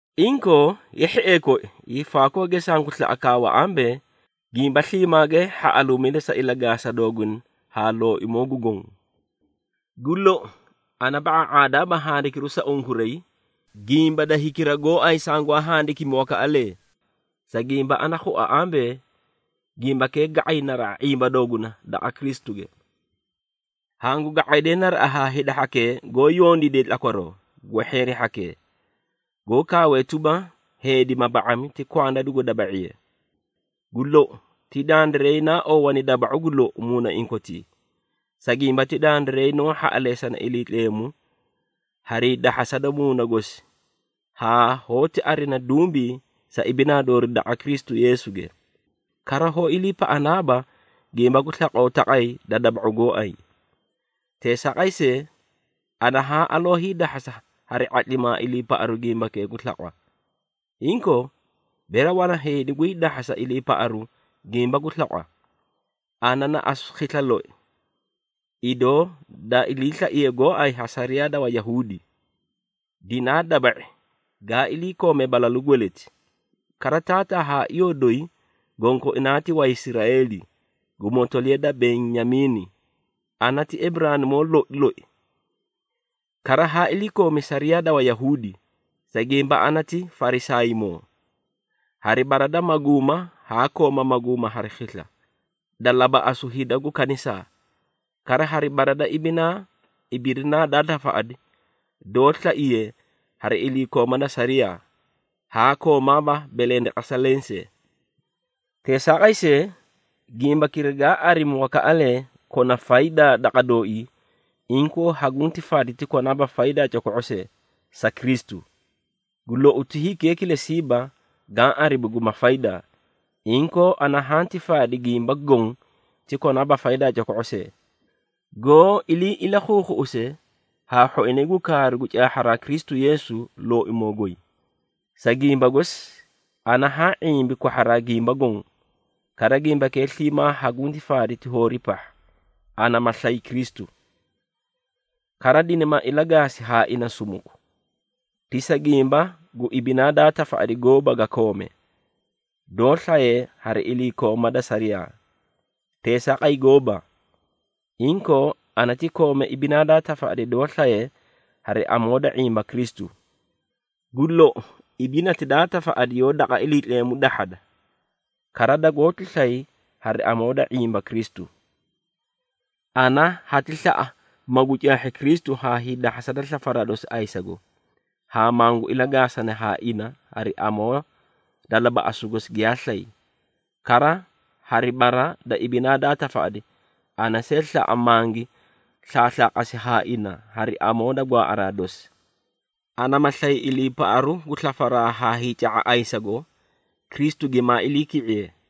Inkoo, ye hhiee koi, hiifaakooge sangu slaꞌa kaawa ambee, gimba sliimaage hhaꞌaluumida sa ilagaasa dooguna haa Looimoo gu Goõ! Gu lou, ana ba⁄aa⁄aadaaba handikiru sa unkuray, gimba da hikira gooay sangwaa handikimi wakaꞌalee, sa gimba ana khua ambee, gimbakee ga⁄ay naraꞌa ⁄imba dooguna daqa Kristuge. Hangu ga⁄aydee naraꞌa haa hida hhakee goó yondiidee tlakwaroo, gwehheeri hhakee, goó kaawee tuba, heedi ma ba⁄ami, ti kwanda dugu daba⁄iye. Gu lou, ti dandiray naa oowani daba⁄u gu lou muunaiĩ kotii, sa gimba ti dandiray noó hhaꞌaleesana Iliitleemu harii dahhasa da Muuna gosi haa hoóti arina dumbii sa ibinaa doori daqa Kristu Yeesuge. Kara hoó iliipaꞌanaaba gimba gu slaqoo taqay da daba⁄u gooay. Teesaaqay see, ana haa aloo hiidahhasa hari ⁄atlimaa iliipaꞌaru gimbakee gu slaqwa. Inkoo, bere wana heedi gu hiidahhasa iliipaꞌaru gimba gu slaqwa, ana na asu khisla loi. Idoo daa iliislaiye gooay ha sariyaa da Wayahuudi, dinaa daba⁄i gaa iliikoome balalu gweleti. Kara taataa haa iyoo doyi gonkoinaa ti Waisraeeli, gu motoliya da Benyamiini, ana ti Eburaanimoo loi loi. Kara haa iliikoomi sariyaa da Wayahuudi, sa gimba ana ti Farisaaymoo. Hari bara da maguuma haa kooma maguuma hari khisla, da labaꞌasu hida gu kanisaa. Kara hari bara da ibinaa ibidinaa daa tafaꞌadi, doó slaye hari iliikooma da sariyaa, haa koomaaba belendeqesa lensee. Teesaaqay see, gimbakira gaa arimi wakaꞌalee kona faydaa daqa dooii, inkoo hagunti faadi ti konaaba faydaa coko⁄o see, sa Kristu. Gu lou, ti hikee kilesiiba gaã arimi guba faydaa, inkoo ana hanti faadi gimba goõ ti konaaba faydaa coko⁄o see, goó ilii ilakhuukhuꞌuse haa hhoinay gu kaaru gu caahharaa Kristu Yeesu, Looimoo goy. Sa gimba gosi, ana haa ⁄imbi kwahharaa gimba goõ, kara gimbakee sliimaa hagunti faadi ti hoori pahha, ana ma slay Kristu. Kara dinima ilagaasi haa ina sumuku, ti sa gimba gu ibinaa daa tafaꞌadi gooba ga koome, doó slaye hari iliikooma da sariyaa. Teesaaqay gooba! Inkoo ana ti koome ibinaa daa tafaꞌadi doó slaye hari amoo da ⁄imba Kristu, gu lou ibinati daa tafaꞌadi yoó daqa Iliitleemu dahhada kara dagoóti slay hari amoo da ⁄imba Kristu. Ana hati slaꞌa magu caahhi Kristu haa hiidahhasa da slafaraa dosi ayisago, haa mangu ilagaasani haa ina hari amoo da labaꞌasu gosi giyaa slay. Kara hari bara da ibinaa daa tafaꞌadi, ana see slaꞌa mangi slaaslaaqasi haa ina hari amoo da gwaaꞌaraa dosi. Ana ma slay iliipaꞌaru gu slafaraa haa hiica⁄a ayisago, Kristu gimaa iliiki⁄iye.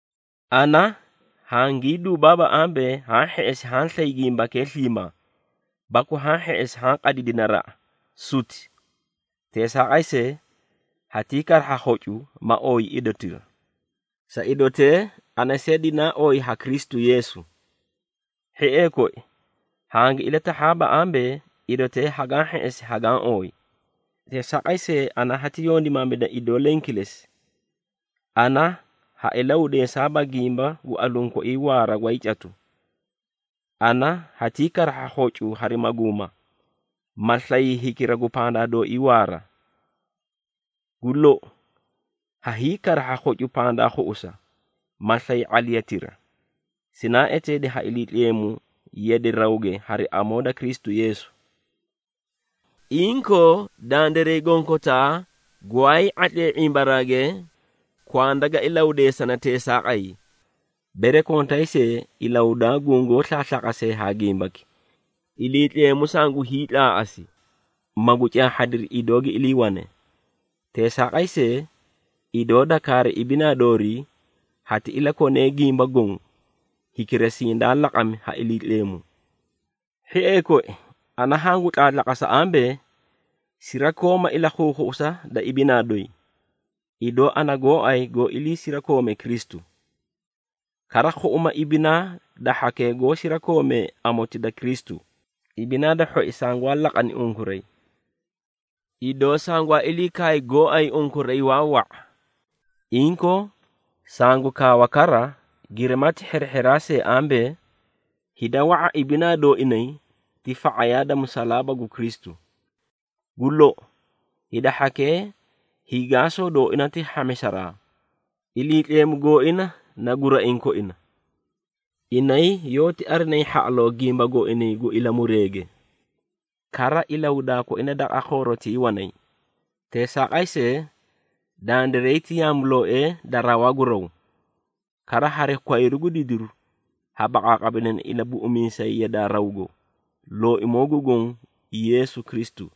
Ana hangii duubaaba ambee, haã hheꞌesi haã slay gimbakee sliimaa, baku haã hheꞌesi haã qadidi naraꞌa, suti! Teesaaqay see, hatii karahha khocu, ma ooyi idotira, sa idotee ana see dinaa ooyi ha Kristu Yeesu. Hhiee koi, hangi ilatahhaaba ambee, idotee hagaã hheꞌesi hagaã ooyi. Teesaaqay see, ana hati yondimaamida idoo leẽ kilesi, ana ha ilahudeesaaba gimba gu aluũ koii waara gwaay catu, ana hatii karahha khocu hari maguuma, ma slay hikira gu pandaa dooii waara. Gu lou, ha hiikarahha khocu pandaa khuꞌusa, ma slayi ⁄aliyatira, sinaa eteedi ha Iliitleemu yade rawge hari amoo da Kristu Yeesu. Inkoo, dandiray gonkotaa gwaayii ⁄atlee ⁄imbaraage, kwanda ga ilahudeesane teesaaqay. Bere kontay see, ilahudaa gungoó slaaslaaqasee haa gimbaki, Iliitleemu sangu hiitlaaꞌasi, magu caahhadiri idoo gi iliiwane. Teesaaqay see, idoo da kaari ibinaa doorii, hati iliikonee gimba goõ, hikira sindaa laqami ha Iliitleemu. Hhiee koi, ana hangu tlaatlaqasa ambee, sirakoomaa ilakhuukhuꞌusa da ibinaa doyi, idoo ana gooay goó iliisirakoome Kristu. Kara khuꞌuma ibinaa da hhakee goó sirakoomee amoti da Kristu, ibinaa da hhoi sangwaa laqani unkuray. Idoo sangwaa ilii kaay gooay unkuray waa wa⁄a, inkoo, sangu kaawa kara, girimati hari hherehheraa see ambee, hida wa⁄a ibinaa dooinay ti fa⁄ayaa da musalaaba gu Kristu. Gu lou, hida hhakee hiigaasoo dooina ti hhamisaraa, iliitleemu gooina na guraiĩ koina. Inay yoóti arinayi hhaꞌaloo gimba gooinay gu ilamureege, kara ilahudaa koina daqa khoorotii wanay. Teesaaqay see, dandiray ti yaamulooee da rawaa gu raw. Kara hari kwayru gu didiru ha baqaaqamidana Ilabuꞌumiisay yadaa rawgo, Looimoo gu Goõ, Yeesu Kristu.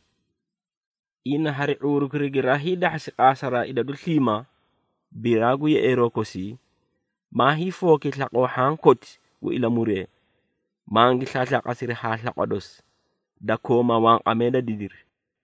Ina hari ⁄uurukira giraa hiidahhasi qaasaraa idadu sliimaa biraa gu yeꞌeeroo kosii, maa hiifooki slaqoo hhaã koti gu ilamuree, mangi slaaslaqasiri haa slaqwa dosi, da kooma wanqamee da didiri.